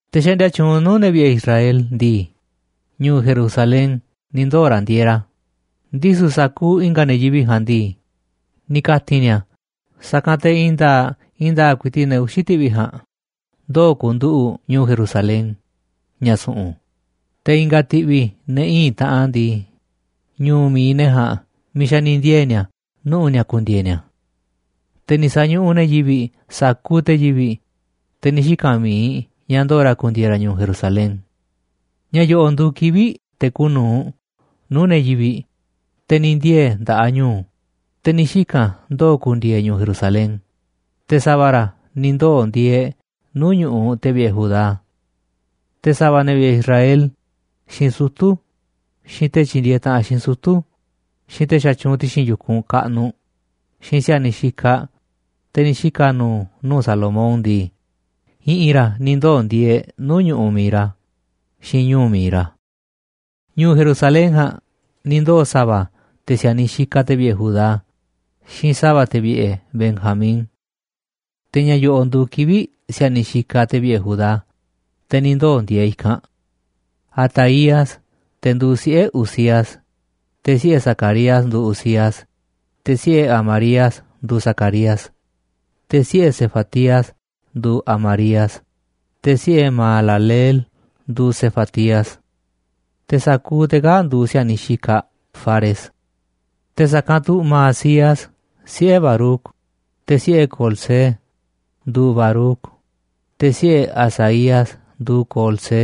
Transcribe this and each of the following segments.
Te̱ xaꞌndia tyuunꞌ nuu̱ꞌ ne̱ vi̱ꞌe̱ Israel ndii, ñu̱u̱ Jerusalén ni̱ ndoo̱ ra̱ ndieeꞌ ra̱. Ndisu̱ sa̱kuuꞌ i̱nga̱ ne̱ yivi̱ꞌ ja̱a̱nꞌ ndii, ni̱ ka̱ti̱n ni̱a̱ sa̱kanꞌ te̱ i̱i̱n nda̱a̱ꞌ i̱i̱n nda̱a̱ꞌ ku̱i̱ti̱ꞌ ne̱ uxi̱ ti̱ꞌvi̱ ja̱a̱nꞌ ndoo̱ ku̱nduꞌu̱ꞌ ñu̱u̱ Jerusalén, ña̱ su̱ꞌu̱n, te̱ i̱nga̱ ti̱ꞌvi̱ ne̱ íin taꞌan ndii, ñu̱u̱ mi̱iꞌ ne̱ ja̱a̱nꞌ miiꞌ xa̱ ni̱ ndiee̱ ni̱a̱ nuꞌu̱ ni̱a̱ ku̱ndi̱e̱e̱ ni̱a̱. Te̱ ni̱ sa̱ñuꞌuꞌ ne̱ yivi̱ꞌ sa̱kuuꞌ te̱ yivi̱ꞌ, te̱ ni̱ xika̱n mi̱iꞌ ña̱ ndo̱o̱ ra̱ ku̱ndi̱e̱e̱ ra̱ ñu̱u̱ Jerusalén. Ña̱ yo̱ꞌo̱ꞌ nduuꞌ kivi̱ꞌ te̱ kuuꞌ nu̱uꞌ nuu̱ꞌ ne̱ yivi̱ꞌ, te̱ ni̱ ndiee̱ nda̱ꞌaꞌ ñu̱u̱, te̱ ni̱ xika̱n ndoo̱ ku̱ndi̱e̱e̱ ñu̱u̱ Jerusalén, te̱ sa̱va̱ ra̱ ni̱ ndoo̱ ndieeꞌ nuu̱ꞌ ñu̱ꞌuꞌ te̱ vi̱ꞌe̱ Judá. Te̱ sa̱va̱ ne̱ vi̱ꞌe̱ Israel, xiinꞌ sutu̱, xiinꞌ te̱ tyindieeꞌ taꞌanꞌ xiinꞌ sutu̱, xiinꞌ te̱ xatyuunꞌ ti̱xi̱n yu̱kunꞌ kaꞌnuꞌ, xiinꞌ si̱a̱niꞌ xikaꞌ te̱ ni̱ xika̱ nu̱u̱ nuu̱ꞌ Salomón ndii, i̱ꞌi̱n ra̱ ni̱ ndoo̱ ndieeꞌ nuu̱ꞌ ñu̱ꞌuꞌ mi̱iꞌ ra̱, xiinꞌ ñu̱u̱ mi̱iꞌ ra̱. Ñu̱u̱ Jerusalén ja̱a̱nꞌ ni̱ ndoo̱ sa̱va̱ te̱ si̱a̱niꞌ xikaꞌ te̱ vi̱ꞌe̱ Judá xiinꞌ sa̱va̱ te̱ vi̱ꞌe̱ Benjamín. Te̱ ña̱ yo̱ꞌo̱ꞌ nduuꞌ kivi̱ꞌ si̱a̱niꞌ xikaꞌ te̱ vi̱ꞌe̱ Judá, te̱ ni̱ ndoo̱ ndieeꞌ i̱kanꞌ: Ataías, te̱ nduuꞌ siꞌe̱ Uzías, te̱ siꞌe̱ Zacarías nduuꞌ Uzías, te̱ siꞌe̱ Amarías nduuꞌ Zacarías, te̱ siꞌe̱ Sefatías nduuꞌ Amarías, te̱ siꞌe̱ Mahalaleel nduuꞌ Sefatías. Te̱ sa̱kuuꞌ te̱ kaa̱ꞌ nduuꞌ si̱a̱niꞌ xikaꞌ Fares. Te̱ sa̱kanꞌ tu̱ Maasías, siꞌe̱ Baruc, te̱ siꞌe̱ Colhoze nduuꞌ Baruc, te̱ siꞌe̱ Hazaías nduuꞌ Colhoze,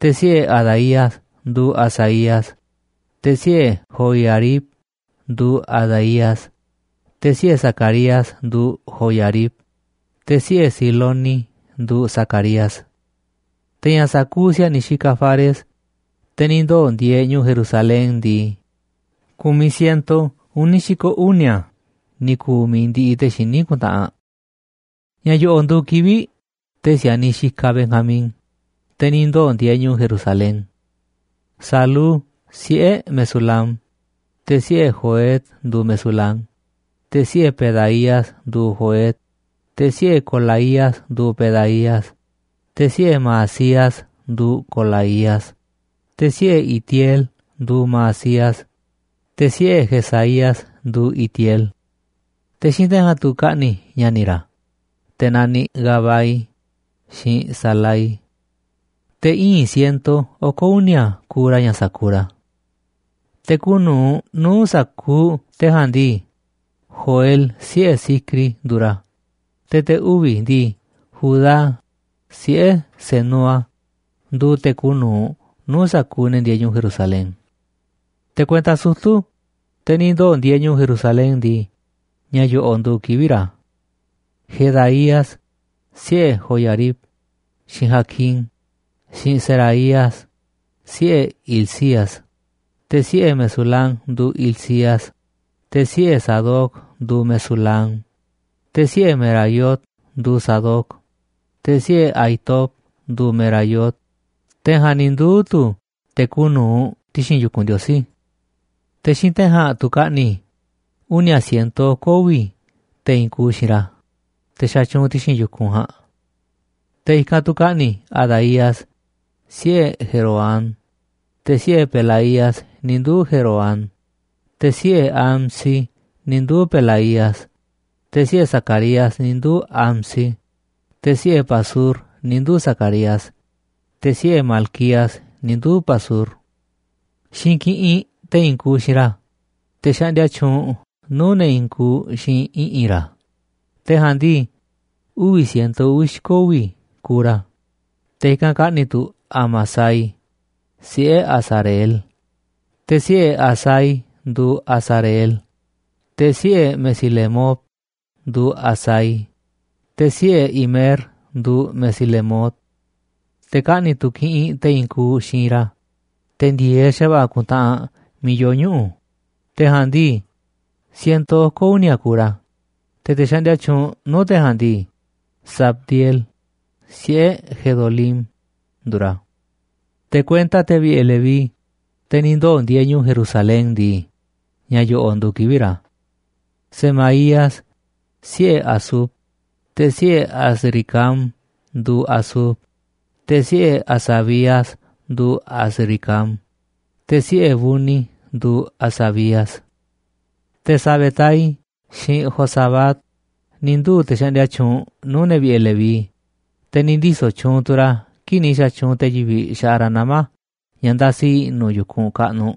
te̱ siꞌe̱ Adaías nduuꞌ Hazaías, te̱ siꞌe̱ Joiarib nduuꞌ Adaías, te̱ siꞌe̱ Zacarías nduuꞌ Joiarib, te̱ siꞌe̱ Siloni nduuꞌ Zacarías. Te̱ ña̱ sa̱kuuꞌ si̱a̱niꞌ xikaꞌ Fares, te̱ ni̱ ndoo̱ ndieeꞌ ñu̱u̱ Jerusalén ndii, ku̱miꞌ siento uni̱ xi̱ko̱ uni̱a̱ ni̱ ku̱u̱ mi̱iꞌ ndi̱ꞌi̱ te̱ xiní ku̱ntaꞌanꞌ. Ña̱ yo̱ꞌo̱ꞌ nduuꞌ kivi̱ꞌ te̱ si̱a̱niꞌ xikaꞌ Benjamín, te̱ ni̱ ndoo̱ ndieeꞌ ñu̱u̱ Jerusalén: Salú, siꞌe̱ Mesulam, te̱ siꞌe̱ Joed nduuꞌ Mesulam, te̱ siꞌe̱ Pedaías nduuꞌ Joed, te̱ siꞌe̱ Colaías nduuꞌ Pedaías, te̱ siꞌe̱ Maasías nduuꞌ Colaías, te̱ siꞌe̱ Itiel nduuꞌ Maasías, te̱ siꞌe̱ Jesaías nduuꞌ Itiel. Te̱ xiinꞌ te̱ ja̱a̱nꞌ tu̱ kaꞌni̱ ña̱ni̱ ra̱, te̱ naniꞌ Gabai, xiinꞌ Salai. Te̱ íin siento oko̱ uni̱a̱ kuuꞌ ra̱ ña̱ sa̱kuuꞌ ra̱. Te̱ kuuꞌ nu̱uꞌ nu̱uꞌ sa̱kuuꞌ te̱ ja̱a̱nꞌ ndii, Joel, siꞌe̱ Zicri, nduuꞌ ra̱, te̱ te̱ uvi̱ ndii, Judá, siꞌe̱ Senúa, nduuꞌ te̱ kuuꞌ nu̱uꞌ nuu̱ꞌ sa̱kuuꞌ ne̱ ndieeꞌ ñu̱u̱ Jerusalén. Te̱ kuenta sutu̱, te̱ ni̱ ndoo̱ ndieeꞌ ñu̱u̱ Jerusalén ndii, ña̱ yo̱ꞌo̱ꞌ nduuꞌ kivi̱ꞌ ra̱: Jedaías, siꞌe̱ Joiarib, xiinꞌ Jaquín, xiinꞌ Seraías, siꞌe̱ Hilcías, te̱ siꞌe̱ Mesulam nduuꞌ Hilcías, te̱ siꞌe̱ Sadoc nduuꞌ Mesulam, te̱ siꞌe̱ Meraiot nduuꞌ Sadoc, te̱ siꞌe̱ Ahitob nduuꞌ Meraiot, te̱ ja̱a̱nꞌ ni̱ nduu̱ tu̱ te̱ kuuꞌ nu̱uꞌ ti̱xi̱n yu̱kunꞌ Ndiosí. Te̱ xiinꞌ te̱ ja̱a̱nꞌ tu̱ kaꞌni̱ uni̱a̱ siento oko̱ uvi̱ te̱ i̱i̱n kuuꞌ xiinꞌ ra̱, te̱ xatyuunꞌ ti̱xi̱n yu̱kunꞌ ja̱a̱nꞌ. Te̱ i̱kanꞌ tu̱ kaꞌni̱ Adaías, siꞌe̱ Jeroham, te̱ siꞌe̱ Pelaías ni̱ nduu̱ Jeroham, te̱ siꞌe̱ Amsi ni̱ nduu̱ Pelaías, te̱ siꞌe̱ Zacarías ni̱ nduu̱ Amsi, te̱ siꞌe̱ Pasur ni̱ nduu̱ Zacarías, te̱ siꞌe̱ Malquías ni̱ nduu̱ Pasur. Xiinꞌ kiꞌinꞌ te̱ i̱i̱n kuuꞌ xiinꞌ ra̱, te̱ xaꞌndia tyuunꞌ nuu̱ꞌ ne̱ i̱i̱n kuuꞌ xiinꞌ i̱ꞌi̱n ra̱, te̱ ja̱a̱nꞌ ndii, uvi̱ siento uvi̱ xi̱ko̱ uvi̱ kuuꞌ ra̱, te̱ i̱kanꞌ kaꞌni̱ tu̱ Amasai, siꞌe̱ Azareel, te̱ siꞌe̱ Azai nduuꞌ Azareel, te̱ siꞌe̱ Mesilemot nduuꞌ Azai, te̱ siꞌe̱ Imer nduuꞌ Mesilemot. Te̱ kaꞌni̱ tu̱ kiꞌinꞌ te̱ i̱i̱n kuuꞌ xiinꞌ ra̱, te̱ ndi̱e̱eꞌ xa̱va̱ꞌa̱ ku̱ntaꞌanꞌ miiꞌ yoo ñuꞌu̱, te̱ ja̱a̱nꞌ ndii, siento oko̱ uni̱a̱ kuuꞌ ra̱, te̱ te̱ xaꞌndia tyuunꞌ nuu̱ꞌ te̱ ja̱a̱nꞌ ndii, Zabdiel, siꞌe̱ Gedolim, nduuꞌ ra̱. Te̱ kuenta te̱ vi̱ꞌe̱ Leví, te̱ ni̱ ndoo̱ ndieeꞌ ñu̱u̱ Jerusalén ndii, ña̱ yo̱ꞌo̱ꞌ nduuꞌ kivi̱ꞌ ra̱: Semaías, siꞌe̱ Hasub, te̱ siꞌe̱ Azricam nduuꞌ Hasub, te̱ siꞌe̱ Hasabías nduuꞌ Azricam, te̱ siꞌe̱ Buni nduuꞌ Hasabías. Te̱ Sabetai xiinꞌ Jozabad ni̱ nduu̱ te̱ xaꞌndia tyuunꞌ nuu̱ꞌ ne̱ vi̱ꞌe̱ Leví, te̱ ni̱ ndiso̱ tyuunꞌ tu̱ ra̱ kii̱ꞌ ni̱ xa̱tyuunꞌ te̱ yivi̱ꞌ xaꞌa ra̱ nama̱ ña̱ ndasi i̱ꞌnu̱ yu̱kunꞌ kaꞌnuꞌ,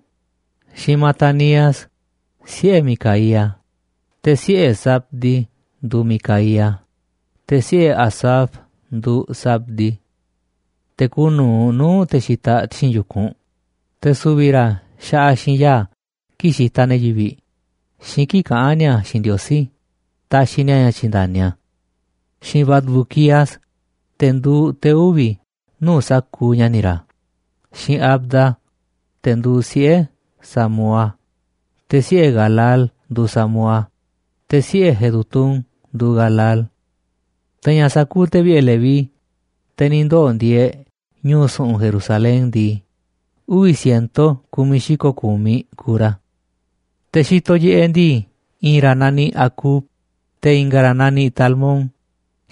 xiinꞌ Matanías, siꞌe̱ Micaía, te̱ siꞌe̱ Zabdi nduuꞌ Micaía, te̱ siꞌe̱ Asaf nduuꞌ Zabdi. Te̱ kuuꞌ nu̱uꞌ nuu̱ꞌ te̱ xitaꞌ ti̱xi̱n yu̱kunꞌ, te̱ su̱vi̱ ra̱ xaꞌaꞌ xiinꞌ ya̱a̱ kii̱ꞌ xitaꞌ ne̱ yivi̱ꞌ xiinꞌ kii̱ꞌ kaꞌán ni̱a̱ xiinꞌ Ndiosí taxiꞌ ni̱a̱ ña̱ tyi̱nda̱ni a̱. Xiinꞌ Bacbuquías, te̱ nduuꞌ te̱ uvi̱ nuu̱ꞌ sa̱kuuꞌ ña̱ni̱ ra̱, xiinꞌ Abda, te̱ nduuꞌ siꞌe̱ Samúa, te̱ siꞌe̱ Galal nduuꞌ Samúa, te̱ siꞌe̱ Jedutún nduuꞌ Galal. Te̱ ña̱ sa̱kuuꞌ te̱ vi̱ꞌe̱ Leví, te̱ ni̱ ndoo̱ ndieeꞌ ñu̱u̱ su̱ꞌu̱n Jerusalén ndii, uvi̱ siento ku̱miꞌ xi̱ko̱ ku̱miꞌ kuuꞌ ra̱. Te̱ xitoꞌ yiꞌeꞌ ndii, i̱i̱n ra̱ naniꞌ Acub, te̱ i̱nga̱ ra̱ naniꞌ Talmón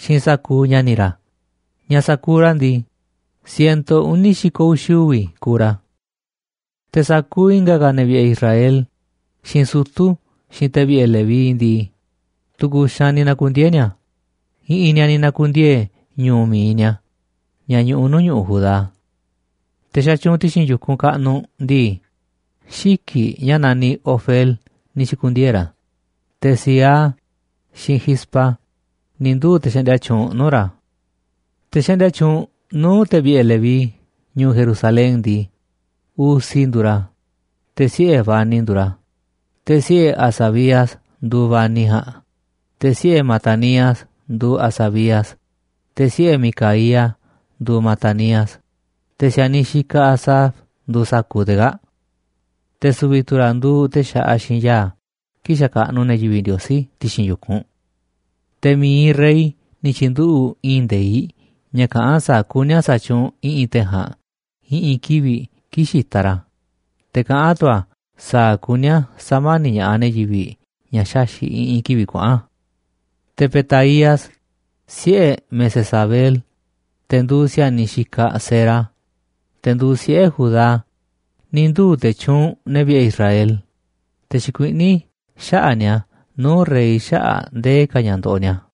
xiinꞌ sa̱kuuꞌ ña̱ni̱ ra̱, ña̱ sa̱kuuꞌ ra̱ ndii, sineto uni̱ xi̱ko̱ uxi̱ uvi̱ kuuꞌ ra̱. Te̱ sa̱kuuꞌ i̱nga̱ ka̱ ne̱ vi̱ꞌe̱ Israel, xiinꞌ sutu̱, xiinꞌ te̱ vi̱ꞌe̱ Leví ndii, tu̱ku̱ xaanꞌ ni̱ na̱ku̱ndiee̱ ni̱a̱, i̱ꞌi̱n ni̱a̱ ni̱ na̱ku̱ndiee̱ ñu̱u̱ mi̱iꞌ ni̱a̱ ña̱ ñuꞌuꞌ nuu̱ꞌ ñu̱ꞌuꞌ Judá. Te̱ xatyuunꞌ ti̱xi̱n yu̱kunꞌ kaꞌnuꞌ ndii, xiki̱ꞌ ña̱ naniꞌ Ofel ni̱ xi̱ku̱ndiee̱ ra̱, te̱ Ziha, xiinꞌ Gispa ni̱ nduu̱ te̱ xaꞌndia tyuunꞌ nuu̱ꞌ ra̱. Te̱ xaꞌndia tyuunꞌ nuu̱ꞌ te̱ vi̱ꞌe̱ Leví ñu̱u̱ Jerusalén ndii, Uzi nduuꞌ ra̱, te̱ siꞌe̱ Bani nduuꞌ ra̱, te̱ siꞌe̱ Hasabías nduuꞌ Bani ja̱a̱nꞌ, te̱ siꞌe̱ Matanías nduuꞌ Hasabías, te̱ siꞌe̱ Micaía nduuꞌ Matanías, te̱ si̱a̱niꞌ xikaꞌ Asaf nduuꞌ sa̱kuuꞌ te̱ kaa̱ꞌ. Te̱ su̱vi̱ tu̱ ra̱ nduuꞌ te̱ xaꞌaꞌ xiinꞌ ya̱a̱ kii̱ꞌ xakaꞌnuꞌ ne̱ yivi̱ꞌ Ndiosí ti̱xi̱n yu̱kunꞌ. Te̱ mi̱iꞌ rey ni̱ tyi̱nduꞌu̱ꞌ i̱i̱n nde̱iꞌ ña̱ kaꞌán sa̱a̱ kuní a̱ sa̱tyuunꞌ i̱ꞌi̱n te̱ ja̱a̱nꞌ i̱ꞌi̱n kivi̱ꞌ kii̱ꞌ xitaꞌ ra̱, te̱ kaꞌán tu̱ a̱ sa̱a̱ kuní a̱ sa̱mani̱ꞌ ña̱ꞌaꞌ ne̱ yivi̱ꞌ ña̱ xaxi̱ꞌ i̱ꞌi̱n kivi̱ꞌ kuaꞌa̱n. Te̱ Petaías, siꞌe̱ Mesezabeel, te̱ nduuꞌ si̱a̱niꞌ xikaꞌ Zera, te̱ nduuꞌ siꞌe̱ Judá, ni̱ nduu̱ te̱ tyuunꞌ ne̱ vi̱ꞌe̱ Israel, te̱ xikuiꞌní xaꞌa̱ꞌ ni̱a̱ nuu̱ꞌ rey xaꞌa̱ꞌ ndee ka̱ ña̱ ndoꞌoꞌ ni̱a̱.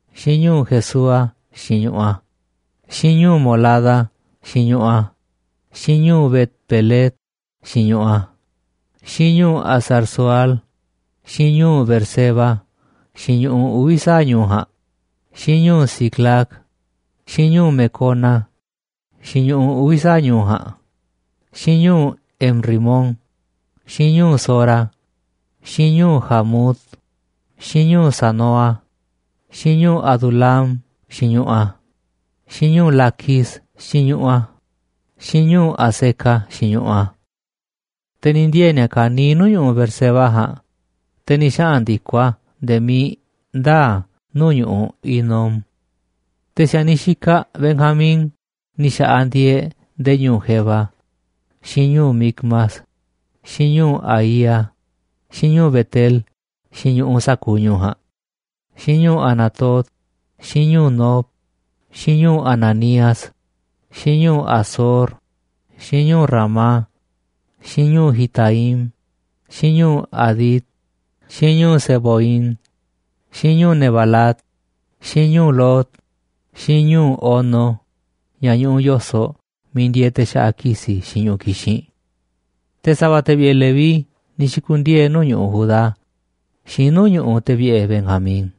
xiinꞌ ñu̱u̱ Jesúa xiinꞌ ñu̱ꞌuꞌ a̱, xiinꞌ ñu̱u̱ Molada xiinꞌ ñu̱ꞌuꞌ a̱, xiinꞌ ñu̱u̱ Bet-pelet xiinꞌ ñu̱ꞌuꞌ a̱, xiinꞌ ñu̱u̱ Hazar-sual, xiinꞌ ñu̱u̱ Beerseba xiinꞌ ñu̱ꞌuꞌ uvi̱ sa̱aꞌ ñu̱u̱ ja̱a̱nꞌ, xiinꞌ ñu̱u̱ Siclag, xiinꞌ ñu̱u̱ Mecona xiinꞌ ñu̱ꞌuꞌ uvi̱ sa̱aꞌ ñu̱u̱ ja̱a̱nꞌ, xiinꞌ ñu̱u̱ En-rimón, xiinꞌ ñu̱u̱ Zora, xiinꞌ ñu̱u̱ Jarmut, xiinꞌ ñu̱u̱ Zanoa, xiinꞌ ñu̱u̱ Adulam xiinꞌ ñu̱ꞌuꞌ a̱, xiinꞌ ñu̱u̱ Laquis xiinꞌ ñu̱ꞌuꞌ a̱, xiinꞌ ñu̱u̱ Azeca xiinꞌ ñu̱ꞌuꞌ a̱. Te̱ ni̱ ndiee̱ ni̱a̱ kaniiꞌ nuu̱ꞌ ñu̱ꞌuꞌ Beerseba ja̱a̱nꞌ, te̱ ni̱ xaꞌa̱n ndi̱koꞌ a̱ nde̱e̱ miiꞌ ndaa̱ nuu̱ꞌ ñu̱ꞌuꞌ Hinom. Te̱ si̱a̱niꞌ xikaꞌ Benjamín ni̱ xa̱ꞌaꞌ ndieeꞌ nde̱e̱ ñu̱u̱ Geba, xiinꞌ ñu̱u̱ Micmas, xiinꞌ ñu̱u̱ Aía, xiinꞌ ñu̱u̱ Bet-el xiinꞌ ñu̱ꞌuꞌ sa̱kuuꞌ ñu̱u̱ ja̱a̱nꞌ, xiinꞌ ñu̱u̱ Anatot, xiinꞌ ñu̱u̱ Nob, xiinꞌ ñu̱u̱ Ananías, xiinꞌ ñu̱u̱ Hazor, xiinꞌ ñu̱u̱ Ramá, xiinꞌ ñu̱u̱ Gitaim, xiinꞌ ñu̱u̱ Hadid, xiinꞌ ñu̱u̱ Seboim, xiinꞌ ñu̱u̱ Nebalat, xiinꞌ ñu̱u̱ Lod, xiinꞌ ñu̱u̱ Ono ña̱ ñuꞌuꞌ yo̱soꞌ miiꞌ ndieeꞌ te̱ xaꞌa ki̱si̱ xiinꞌ ñu̱ꞌuꞌ kixinꞌ. Te̱ sa̱va̱ te̱ vi̱ꞌe̱ Leví ni̱ xi̱ku̱ndiee̱ nuu̱ꞌ ñu̱ꞌuꞌ Judá, xiinꞌ nuu̱ꞌ ñu̱ꞌuꞌ te̱ vi̱ꞌe̱ Benjamín.